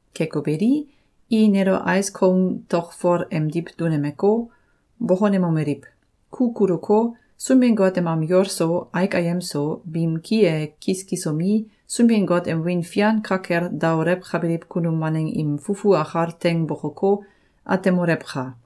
Keko beli, i nelo ais koung tokfol emdiw dunemeko, bokonemomeliw: “Ku kuluko, Sunbin-Got em am yol so, aik ayem so, biim ki e kiskisomi, Sunbin-Got em wiin fian ka kel daolewkabiliw kunum waneng im fufu akal teing bokoko, atemolewka!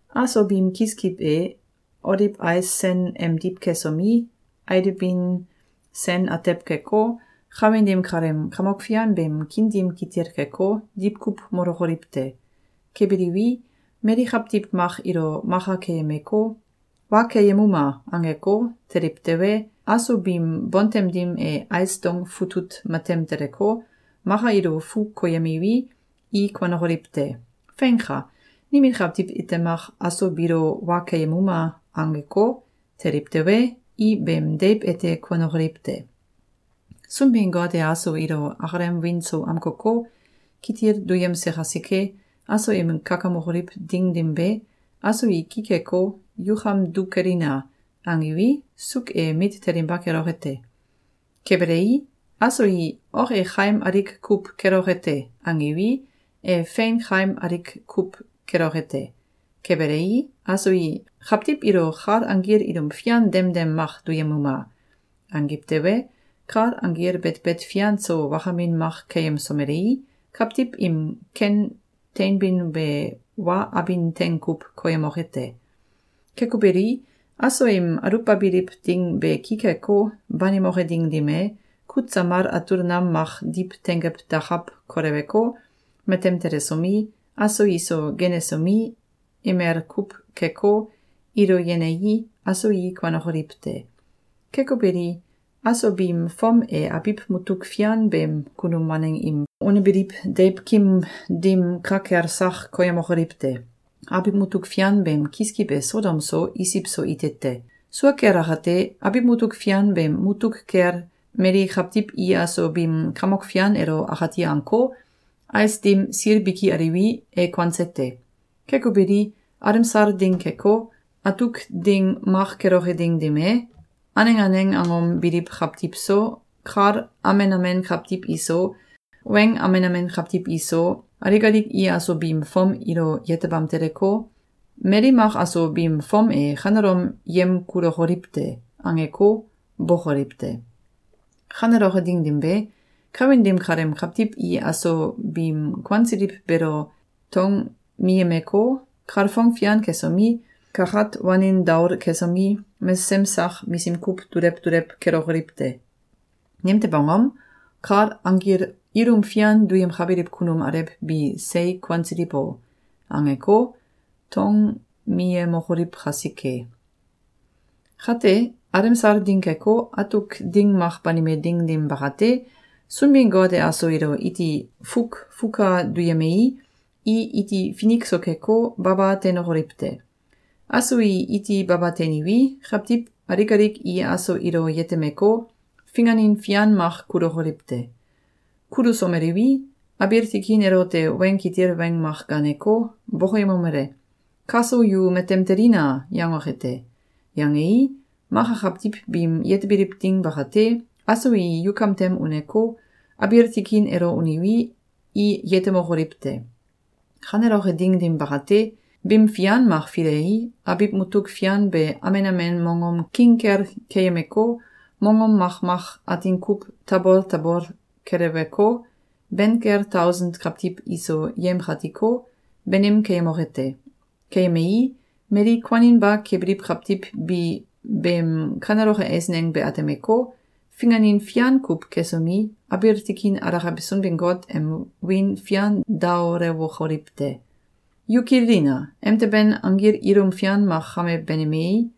Aso biim kiskiw e oliw ais sen emdiw kesomi, alibin sen atew keko, kawin dim kaleem Kamok Fian beem kiin dim kitil keko, diwkuw molokoliw te. Kebiliwi, mali kawtiw mak ilo maka keyemeko, “Wa keyemuma!”, angeko, teliw tewe, aso biim bontem dim e ais dong futut matem teleko, maka ilo fu koyemiwi, i kuanokoliw te. Feinka! Nimin kawtiw ite mak “Aso biilo wa keyemuma!”, angeko, teliw tewe, i beem deiw ete kuanokoliw te. Sunbin-Got e aso ilo akalem wiin so amkoko, kitil duyemse kasike, aso im kakamokoliw ding dim be, aso i ki keko, “Yukam du kelina!”, angiwi, suuk e mit telinba keloke te. Kebelei, aso i “Ok e kaim alik kuw keloke te!”, angiwi, e fein kaim alik kuw keloke te. Kebelei, aso i “Kawtiw ilo kal anggil ilum fian demdem mak duyemuma!”, angiw tewe, kal anggil betbet fian so wakamin mak keyemsomelei, kawtiw im ken teinbin be wa abin teng kuw koyemoke te. Keko beli, aso im aluwbabiliw ding be ki keko, banimoke ding dim e, kut samal atul nam mak diw tengew dakaw koleweko, matem telesomi, aso iso genesomi, emel kuw keko, ilo yenei, aso i kuanokoliw te. Keko beli, aso biim fom e abiw mutuk fian beem kunum waneng im unebiliw deiwkim dim ka kel sak koyemokoliw te. Abiw mutuk fian beem kiskiw e Sodom so, Isiw so ite te. Sua kel akate, abiw mutuk fian beem mutuk kel mali kawtiw i aso biim Kamok Fian elo akati anko, ais dim sil biki aliwi, e kuanse te. Keko beli, alemsal ding keko, atuk ding mak keloke ding dim e, aneng aneng angom biliw kawtiw so, kal amen amen kawtiw iso, weng amen amen kawtiw iso, alik alik i aso biim fom ilo yetebam teleko, “Mali mak aso biim fom e kanelom yemkulokoliw te!”, angeko, bókoliw te. Kaneloke ding dim be, kawin dim kaleem kawtiw i aso biim kuansiliw beelo tongmiyemeko, kalfong fian kesomi, kakat wanin daol kesomi, mesesem sak misim kuw dulew dulew kelokoliw te. Nimtew angom? “Kal anggil ilum fian duyemkabiliw kunum alew bi sei kuansiliw o!”, angeko, tongmiyemokoliw kasike. Kate, alemsal ding keko, atuk ding mak banime ding dim bakate, Sunbin-Got e aso ilo iti fukfuka duyemei, i iti finik so keko, baba teinokoliw te. Aso i iti baba teiniwi, kawtiw alik alik i aso ilo yetemeko, finganin fian mak kulokoliw te. Kulusomeliwi, abiil tikin elote weng kitil weng mak gaaneko, bokoyemomele: “Kaso yu matem telina!”, yangoke te. Yangei, maka kawtiw biim yetebiliw ding bakate, aso i yukam tem uneko, abiil tikin elo uniwi, i yetemokoliw te. Kaneloke ding dim bakate, bim fian mak filei, abiw mutuk fian be amen amen mongom king kel keyemeko, mongom makmak atin kuw tabol tabol keleweko, ben kel tausen kawtiw iso yemkatiko, banim keyemoke te. Keyemei, mali kuaninba kebiliw kawtiw bi beem kaneloke eisneng be atemeko, finganin fian kuw kesomi, abiil tikin alakabe Sunbin-Got em wiin fian daolewokoliw te. Yu kililina! Emteben anggil ilum fian mak kame banimei,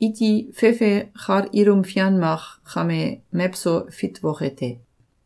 iti fefe kal ilum fian mak kame mewso fitwoke te.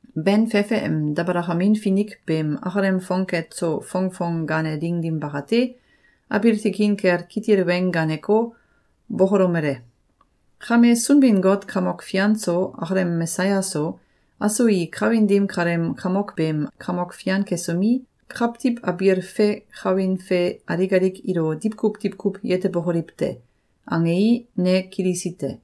Ben fefe em dabalakamin finik beem akalem fongket so fongfong gaane ding dim bakate, abiil tikin kel kitil weng gaaneko, bokolomele: “Kame Sunbin-Got Kamok Fian so, akalem Mesaya so, aso i kawin dim kaleem kamok beem kamok fian kesomi, kawtiw abiil fe kawin fe alik alik ilo diwkuw diwkuw yetebokoliw te.”, angei, ne kilisi te.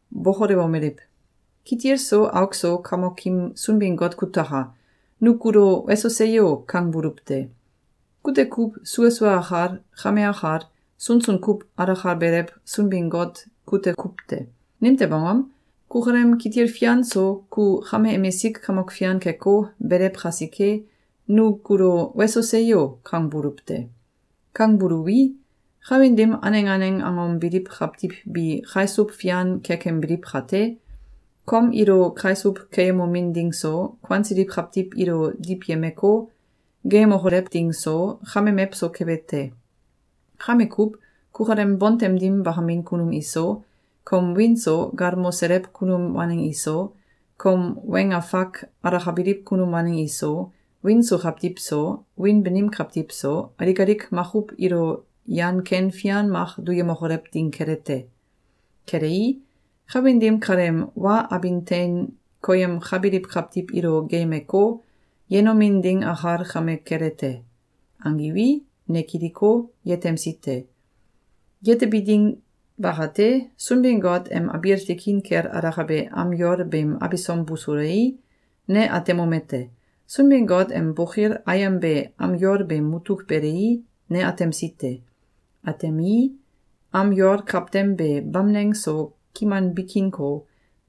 bokolewomeliw: “Kitil so auk so Kamokim Sunbin-Got kutaka! Nu kulo “Weso! Seyo!”, kangbuluw te. Kute kuw sua sua akal, kame akal, sunsun kuw alakabelew Sunbin-Got kute kuw te! Nimtew angom? Kukalem kitil fian so ku kame emisik Kamok Fian keko, belew kasike, nu kulo “Weso! Seyo!”, kangbuluw te! Kangbuluwi, kawin dim aneng aneng angom biliw kawtiw bi kaisuw fian kekembiliw kate, kom ilo kaisuw keyemomin ding so, kuansiliw kawtiw ilo diwyemeko, geeyemokolew ding so, kame mewso kebe te. Kame kuw, kukalem bontem dim bakamin kunum iso, kom wiin so galmoselew kunum waneng iso, kom weng afak alakabiliw kunum waneng iso, wiin so kawtiw so, wiin banim kawtiw so, alik alik makuw ilo yan ken fian mak duyemokolew ding kele te. Kelei, kawin dim kaleem wa abin tein koyemkabiliw kawtiw ilo geeyemeko, yenomin ding akal kame kele te.”, angiwi, ne kiliko, yetemsi te. Yetebi ding bakate, Sunbin-Got em abiil tikin kel alakabe am yol beem abisom busulei, ne atemomete: Sunbin-Got em bokil ayem be am yol beem mutuk belei, ne atemsi te. Atemii, am yol kawtem be bamneng so, kiman bikinko,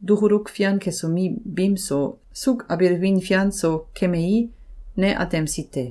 dukuluk fian kesomi, bim so, suuk abiil win fian so, kemei, ne atemsi te.